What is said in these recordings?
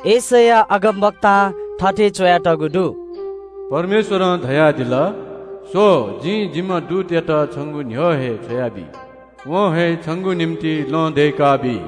यशैया अगमवक्तां थथे च्‍वयातःगु दु – “परमेश्‍वरं धयादिल – ‘स्‍व, जिं जिम्‍ह दूतयात छंगु न्‍ह्यः न्‍ह्यः छ्वयाबी। वं हे छंगु निंतिं लँ दय्‌काबी।’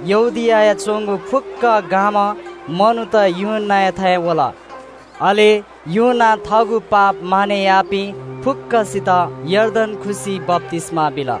यहूदियायागु फुक्‍क गां व यरूशलेमयापिं सकल मनूत यूहन्‍नायाथाय् वल। अले यूहन्‍नां थःगु पाप मानय् याःपिं फुक्‍कसित यर्दन खुसिइ बप्‍तिस्‍मा बिल।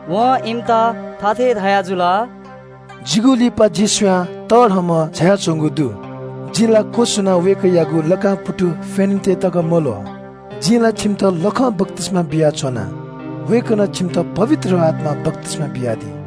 वं इमित थथे धयाजुल – “जिगु लिपा जि स्‍वयाः तःधंम्‍ह झायाच्‍वंगु दु। जि ला क्‍वछुनाः वय्‌कःयागु लाकां पुतु फ्‍यनेत तकं मल्‍वः। जिं ला छिमित लखं बप्‍तिस्‍मा बियाच्‍वना। वय्‌कलं छिमित पवित्र आत्‍मां बप्‍तिस्‍मा बियादी।”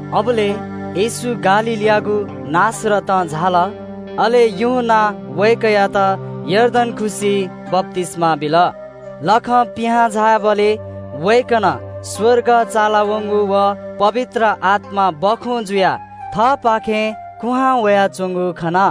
अबलय् येशू गालीलयागु नासरतं झाल, अले यूहन्‍नां वय्‌कःयात यर्दन खुसिइ बप्‍तिस्‍मा बिल। लखं थाहां झाःबलय् वय्‌कलं स्‍वर्ग चालावंगु व पवित्र आत्‍मा सुकुभतु जुयाः थःपाखे कुहां वयाच्‍वंगु खन।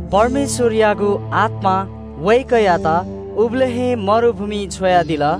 परमेश्‍वरयागु आत्‍मां वय्‌कःयात उबलय् हे मरुभूमिइ छ्वयादिल।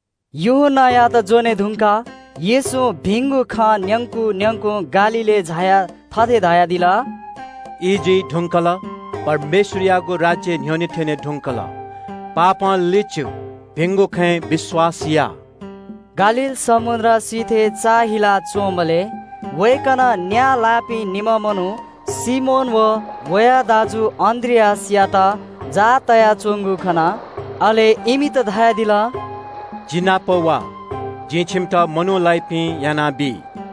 यूहन्‍नायात ज्‍वने धुंकाः येशूं भिंगु खँ न्‍यंकुं न्‍यंकुं गालीलय् झायाः थथे धयादिल – “ई जुइ धुंकल, परमेश्‍वरयागु राज्‍य न्‍ह्यःने थ्‍यने धुंकल। पश्‍चाताप या, भिंगु खँय् विश्‍वास या।” गालील समुद्र सिथय् चाःहिला च्‍वंबलय् वय्‌कलं न्‍या लाइपिं निम्‍ह मनू सिमोन व वया दाजु अन्‍द्रियासयात जाः ह्वानाच्‍वंगु खन। अले इमित धयादिल – “जि नाप वा, जिं छिमित मनू लाइपिं यानाबी।”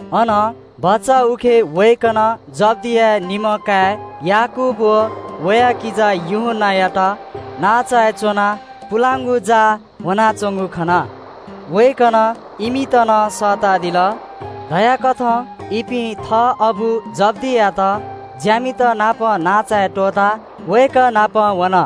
अनं भचा उखे वय्‌कलं जब्‍दिया निम्‍ह काय् याकूब व वया किजा यूहन्‍नायात नांचाय् च्‍वनाः पुलांगु जाः ल्‍ह्वनाच्‍वंगु खन। वय्‌कलं इमित नं सःतादिल। न्‍यनेवं इपिं थः अबु जब्‍दीयात ज्‍यामितनापं नांचाय् त्‍वःताः वय्‌कः नाप वन।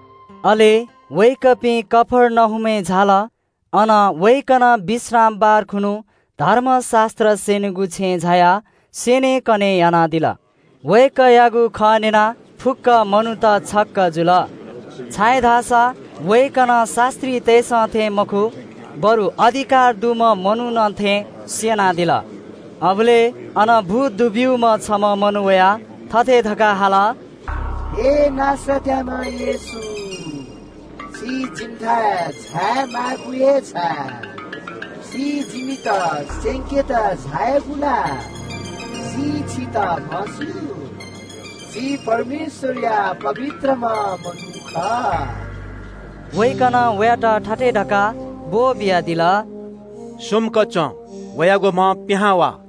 अले वय्‌कःपिं कफर्नहुमय् झाल। अन वय्‌कलं विश्रामबार खुन्‍हु धर्मशास्‍त्र स्‍यनीगु छेँय् झायाः स्‍यनेकने यानादिल। वय्‌कःयागु खँ न्‍यनाः फुक्‍क मनूत छक्‍क जुल। छाय्‌धाःसा वय्‌कलं शास्‍त्रीतय्‌सं थें मखु, बरु अधिकार दुम्‍ह मनुखं थें स्‍यनादिल। अबलय् अन भूत दुब्‍यूम्‍ह छम्‍ह मनू वयाः थथे धकाः हाल – “हे नासरतयाम्‍ह येशू, छि जिमिथाय् झायेमाःगु हे छाय्? छि जिमित नाश यायेत झायागु ला? जिं छितः म्‍हस्‍यू, छि परमेश्‍वरया पवित्रम्‍ह मनू खः।” वय्‌कलं वयात थथे धकाः ब्‍वःबियादिल – “सुम्‍क च्‍वँ। वयागु म्‍हं पिहां वा।”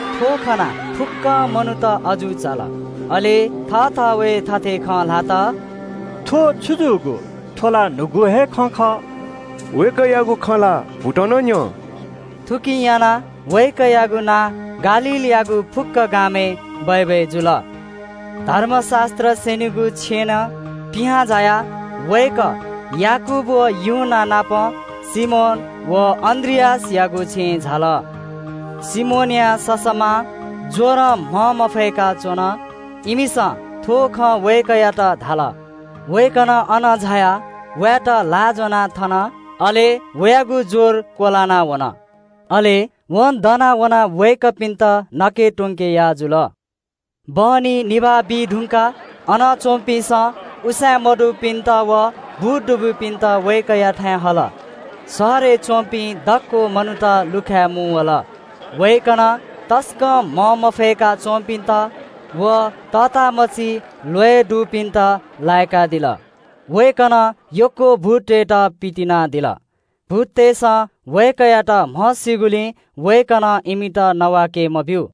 थ्‍व खनाः फुक्‍क मनूत अजू चाल। अले थःथवय् थथे खँ ल्‍हात – “थ्‍व छु जूगु? थ्‍व ला अधिकारं जाःगु न्‍हूगु खँ खः। वय्‌कःयागु खँ ला भूतं नं न्‍यं।” थुकिं यानाः वय्‌कःयागु नां गालीलयागु फुक्‍क थासय् बय्‌बय् जुल। धर्मशास्‍त्र स्‍यनीगु छेँनं पिहां झायाः वय्‌कः याकूब व यूहन्‍ना नाप सिमोन व अन्‍द्रियासयागु छेँय् झाल। सिमोनया ससःमां ज्‍वरं म्‍हंमफय्‌का च्‍वन। इमिसं थ्‍व खँ वय्‌कःयात धाल। वय्‌कलं अन झायाः वयात ल्‍हाः ज्‍वनाः थन, अले वयागु ज्‍वर क्‍वलाना वन। अले वं दना वनाः वय्‌कःपिन्‍त नके त्‍वंके याः जुल। बहनी निभाः बीधुंकाः अन च्‍वंपिन्‍सं उसाँय् मदुपिन्‍त व भूत दुब्‍यूपिन्‍त वय्‌कःयाथाय् हल। शहरय् च्‍वंपिं दक्‍व मनूत लुखाय् मुंवल। वय्‌कलं तसकं म्‍हंमफय्‌का च्‍वंपिन्‍त व तःतामछि ल्‍वय् दुपिन्‍त लाय्‌कादिल। वय्‌कलं यक्‍व भूततय्‌त पितिनादिल। भूततय्‌सं वय्‌कःयात म्‍हस्‍यूगुलिं वय्‌कलं इमित नवाके मब्‍यू।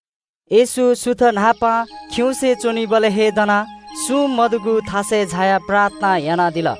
येशू सुथ न्‍हापां खिउँसे च्‍वंबलय् हे दनाः सुं मदुगु थासय् झायाः प्रार्थना यानादिल।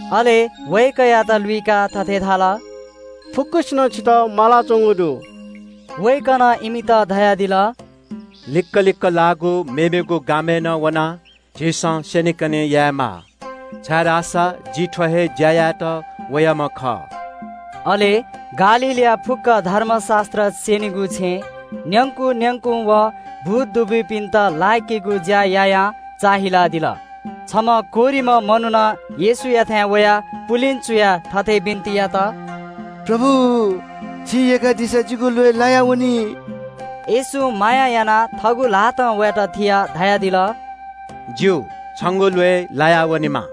अले वय्‌कःयात लुइकाः थथे धाल – “फुक्‍कसिनं छितः मालाच्‍वंगु दु।” वय्‌कलं इमित धयादिल – “लिक्‍क लिक्‍क लाःगु मेमेगु गामय् नं वनेनु, जिं अन नं स्‍यनेकने यायेमाः, छाय्‌धाःसा जि थ्‍व हे ज्‍या यायेत वयाम्‍ह खः।” अले गालीलया फुक्‍क धर्मशास्‍त्र स्‍यनीगु छेँय् न्‍यंकु न्‍यंकुं व भूत दुब्‍यूपिन्‍त लाय्‌केगु ज्‍या यायां चाःहिलादिल। छम्‍ह कोह्रिम्‍ह मनुखं येशूयाथाय् वयाः पुलिं चुयाः थथे बिन्‍ति यात – “प्रभु, छिं यय्‌कादीसा जितः शुद्ध यानादी फु।” येशूं माया यानाः थःगु ल्‍हातं वयात थियाः धयादिल – “ज्‍यू, छंगु ल्‍वय् लाया वनेमा।”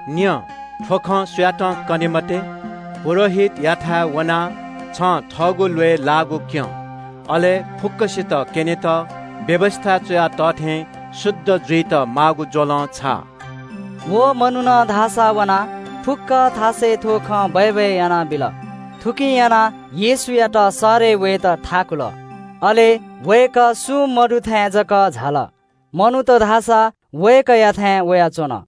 “स्‍व, थ्‍व खँ सुयातं कनादी मते। पुजाहारीयाथाय् वनाः छं थःगु ल्‍वय् लाःगु क्‍यँ। अले फुक्‍कसित क्‍यनेत मोशां धाःथें शुद्ध जुइत माःगु ज्‍वलं छायाब्‍यु।” व मनुखं धाःसा वनाः फुक्‍क थासय् थ्‍व खँ बय्‌बय् यानाबिल। थुकिं यानाः येशूयात शहरय् वयेत थाकुल अले वय्‌कः सुं मदुथाय् च्‍वंझाल। मनूत धाःसा प्‍यखेरं वय्‌कःयाथाय् वयाच्‍वन।